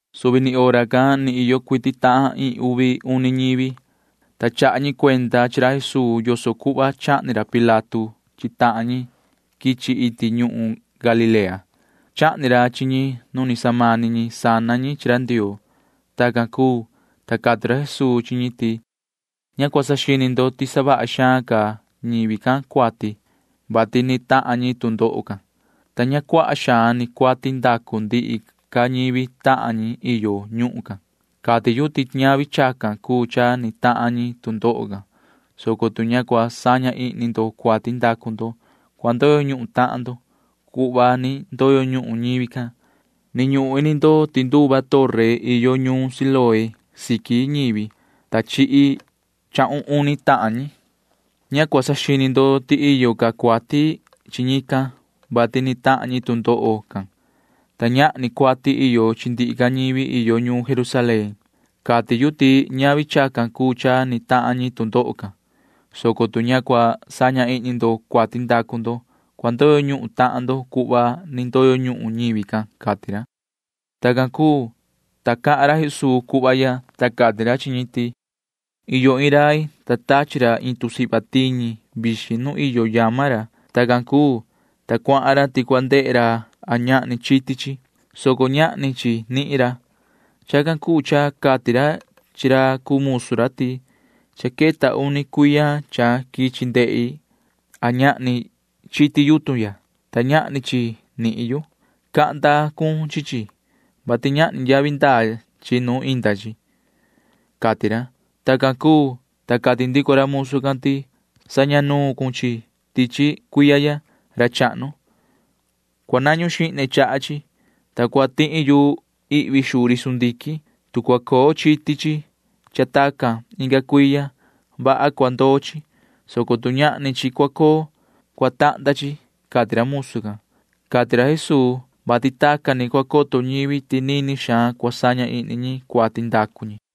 Suvi ni hora can ni iyo cuiti tahan iin uvi uni ñivi, ta chaha ñi cuenda chi ra Jesuu yoso cuhva chahni ra Pilato chi tahan ñi quichi iti ñuhun Galilea. Chahni ra chi ñi nu ni samani ñi sana ñi chi ra Ndioo. Tacan cuu, ta cati ra Jesuu chi ñi ti: ―Ña cua saxini ndo ti savaha xaan ca ñivi can cuati, vati ni tahan ñi tu ndoho can, ta ña cuaha xaan ni cuati ndacu ndihi ca ñivi tahan ñi iyo ñuhun can. Cati yu ti ñavi chacan cuu cha ni tahan ñi tu ndoho can, soco tu ña cua saña ihni ndo cuati ndacu ndo, cua ndoyo ñuhun tahan ndo cuhva ni ndoyo ñuhun ñivi can. Ni ñuhun ini ndo ti nduva torre iyo nuun Siloé siqui ñivi, ta chihi chahun uni tahan ñi. Ña cua saxini ndo ti iyo ca cuati chi ñican, [vati ni tahan ñi tu ndoho can,] ta ñahni cuati iyo chi ndihi ca ñivi iyo ñuun Jerusalén. Cati yu ti ñavi chacan cuu cha ni tahan ñi tu ndoho can, soco tu ña cua saña ihni ndo cuati ndacu ndo, cua ndoyo ñuhun tahan ndo cuhva ni ndoyo ñuhun ñivi can ―cati ra. Tacan cuu, ta cahan ra Jesuu cuhva ya, ta cati ra chi ñi ti: ―Iyo iin rai, ta tachi ra iin tusihva tiñi vixin nu iyo yama ra. Tacan cuu, ta cuahan ra ti cua ndehe ra a ñahni chiti chi, soco ñahni chi nihin ra. Chacan cuu cha cati ra chi ra cuu musu ra ti: “Cha queta uni cuiya cha quichi ndehi a ñahni chiti yutun ya, ta ñahni chi nihin yu. Cahnda cun chi chi, vati ñahni yavi ndaa chi nu inda chi,” cati ra. Tacan cuu, ta cati ndico ra musu can ti: “Saña nuun cun chi chi tichi cuiya ya, ra chahnu. Cua nañu xihne chaha chi, ta cua tihi yu ihvi xuu ri sundiquin. Tu cua coo chiti chi cha tacan inga cuiya, vaha cua ndoo chi, soco tu ñahni chi cua coo, cua tahnda chi,” cati ra musu can ―cati ra Jesuu, [vati tacan ni cua coto ñivi ti nini xaan cua saña ihni ñi cuati ndacu ñi].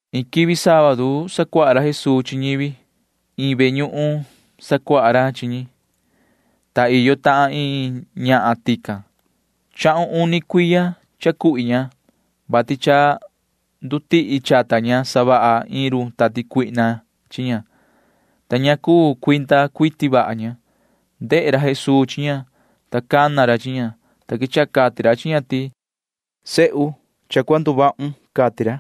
Iin quivi sábadu sacuaha ra Jesuu chi ñivi. Iin ve ñuhun sacuaha ra chi ñi, ta iyo tahan iin ñahan tican. Chahun uni cuiya cha cuhvi ña, vati cha ndutihi chata ña savaha iin run tati cuihna chi ña, ta ña cuu cuinda cuiti vaha ña. Ndehe ra Jesuu chi ña, ta cana ra chi ña, ta quechaha cati ra chi ña ti: ―Yoho sihi, cha cua nduvahun ―cati ra.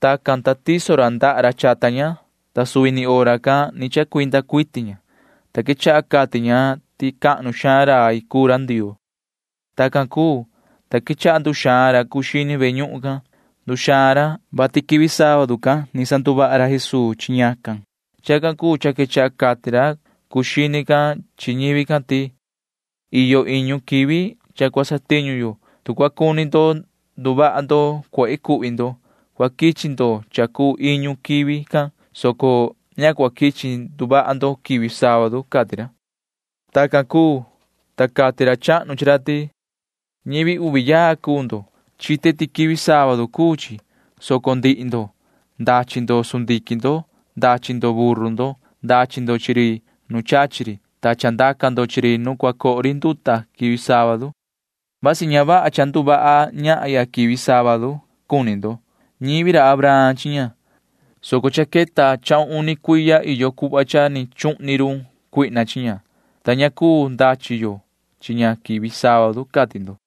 Tacan, ta tiso ra ndaha ra chata ña, ta suvi ni hora can ni chacuinda cuiti ña, ta quechaha cati ña ti cahnu xaan rai cuu ra Ndioo. Tacan cuu, ta quechaha nduxaan ra cuu xini ve ñuhun can. Nduxaan ra, vati quivi sábadu can ni sanduvaha ra Jesuu chi ñacan. Chacan cuu cha quechaha cati ra cuu xini can chi ñivi can ti: ―Iyo iñu quivi cha cua satiñu yo. Tu cua cuni ndo nduvaha ndo cuehe cuhvi ndo, cua quichi ndo cha cuu iñu quivi can, soco ña cua quichi nduvaha ndo quivi sábadu ―cati ra. Tacan cuu, ta cati ra chahnu chi ra ti: ―Ñivi uvi yaa cuu ndo. Chite ti quivi sábadu cuu chi, soco ndihi ndo―ndachi ndo sundiquin ndo. Ndachi ndo buru ndo. Ndachi ndo chi ri nu chachi ri, ta chandaca ndo chi ri nu cua coho ri nduta quivi sábadu. Vasi ña vaha cha nduvaha ñahya quivi sábadu ya cuni ndo. Ñivi ra Abraham chi ña, soco cha queta chahun uni cuiya iyo cuhva cha ni chuhni run Satanaa chi ña, ta ña cuu ndachi yo chi ña quivi sábadu, cati ndo.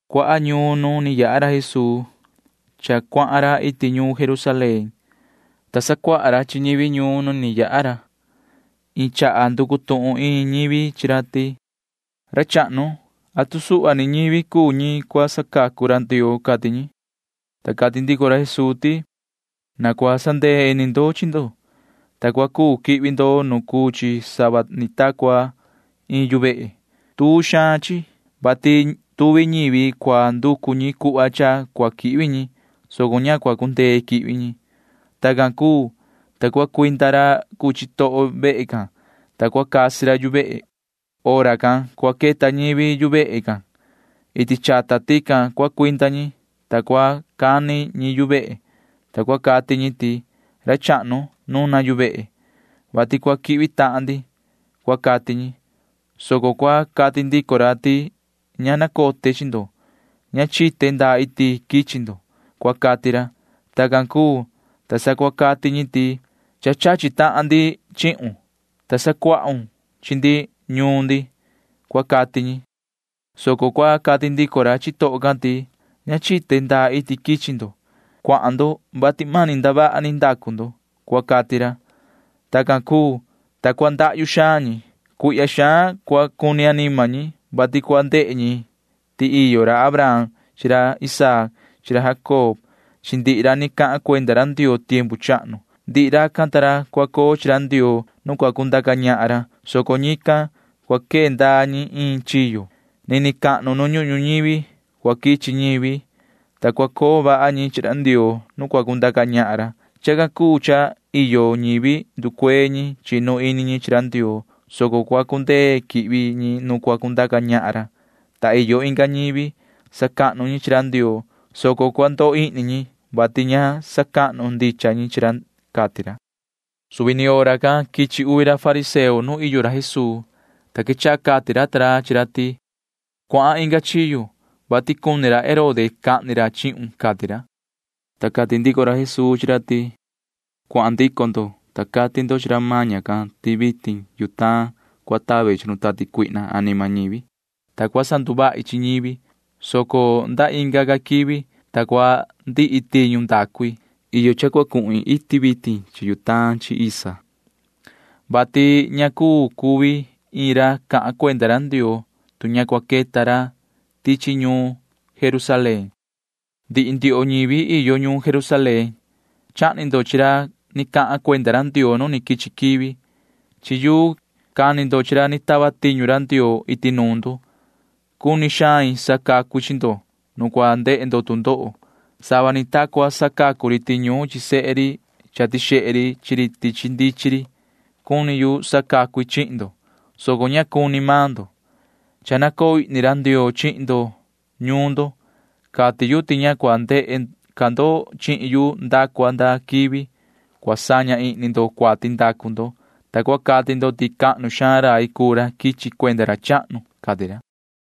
Cuaha ñuun nu ni yaha ra Jesuu cha cuahan ra iti ñuun Jerusalén, ta sacuaha ra chi ñivi ñuun nu ni yaha ra. Iin chaha nducu tuhun iin ñivi chi ra ti: ―Ra chahnu, ¿atu suhva ni ñivi cuu ñi cua sacacu ra Ndioo? ―cati ñi. Ta cati ndico ra Jesuu ti: ―Na cua sandee ini ndo chi ndo, ta cua cuu quihvi ndo nu cuu chi sava ni ta cua iin yu vehe. Tuu xaan chi, vati tuvi ñivi cua nducu ñi cuhva cha cua quihvi ñi, soco ña cua cundee quihvi ñi. Tacan cuu, ta cua cuinda ra cuu chitoho vehe can, ta cua casi ra yu vehe. Hora can cua queta ñivi yu vehe can. Iti chata tican cua cuinda ñi, ta cua cani ñi yu vehe, ta cua cati ñi ti: “Ra chahnu, nuna yu vehe, vati cua quihvi tahan ndi,” cua cati ñi, soco cua cati ndico ra ti: “Ña nacote chi ndo. Ña chite ndaa iti quichi ndo,” cua cati ra. Tacan cuu, ta sa cua cati ñi ti: “Cha chachi tahan ndi chihun, ta sacuahun chi ndi ñuun ndi,” cua cati ñi, soco cua cati ndico ra chitoho can ti: “Ña chite ndaa iti quichi ndo. Cuahan ndo, vati mani ndavaha ni ndacu ndo,” cua cati ra. Tacan cuu, ta cua ndahyu xaan ñi. Cuihya xaan cua cuni anima ñi, vati cua ndehe ñi ti iyo ra Abraham chi ra Isaac chi ra Jacob chi ndihi ra ni cahan cuenda ra Ndioo tiempu chahnu. Ndihi racan ta ra cua coo chi ra Ndioo nu cua cundaca ñahan ra, soco ñican―cua quee ndaa ñi iin chiyo. Nini cahnu nu ñuhun ñuñivi cua quichi ñivi, ta cua coo vaha ñi chi ra Ndioo nu cua cundaca ñahan ra. Chacan cuu cha iyo ñivi nducuee ñi chinu ini ñi chi ra Ndioo, soco cua cundee quihvi ñi nu cua cundaca ñahan ra, ta iyo inga ñivi sacahnu ñi chi ra Ndioo, soco cua ndoo ihni ñi, vati ña sacahnu ndicha ñi chi ra ―cati ra. Suvi ni hora can quichi uvi ra fariseo nu iyo ra Jesuu, ta quechaha cati ra ta ra chi ra ti: ―Cuahan inga chiyo, vati cuni ra Herode cahni ra chihun ―cati ra. Ta cati ndico ra Jesuu chi ra ti: ―Cuahan ndico ndo, ta cati ndo chi ra maña can ti vitin yutaan cua tave chi run tati cuihna anima ñivi, ta cua sanduvahi chi ñivi, soco nda inga ca quivi, ta cua ndihi tiñu ndacu i. Iyo cha cua cuhin iti vitin chi yutaan chi isa, vati ña cuu cuvi iin ra cahan cuenda ra Ndioo, tu ña cua queta ra tichi ñuun ñuun Jerusalén. ’Ndihi ndioho ñivi iyo ñuun Jerusalén, chahni ndo chi ra ni cahan cuenda ra Ndioo nu ni quichi quivi. Chi yuu cani ndo chi ra ni tava tiñu ra Ndioo iti nuun ndo. Cuni xain sacacu i chi ndo nu cua ndehe ndo tu ndoho sava ni ta cua sacacu ri tiñuun chi sehe ri cha tixehe ri chi ri tichi ndichin ri. Cuni yu sacacu i chihin ndo, soco ña cuni maan ndo. Cha nacoo ihni ra Ndioo chihin ndo ñuun ndo. Cati yu ti ña cua ndehe ca ndo chihin yu nda cua nda quivi [cua saña ihni ndo cuati ndacu ndo], ta cua cati ndo ti cahnu xaan rai cuu ra quichi cuenda ra chahnu ―cati ra.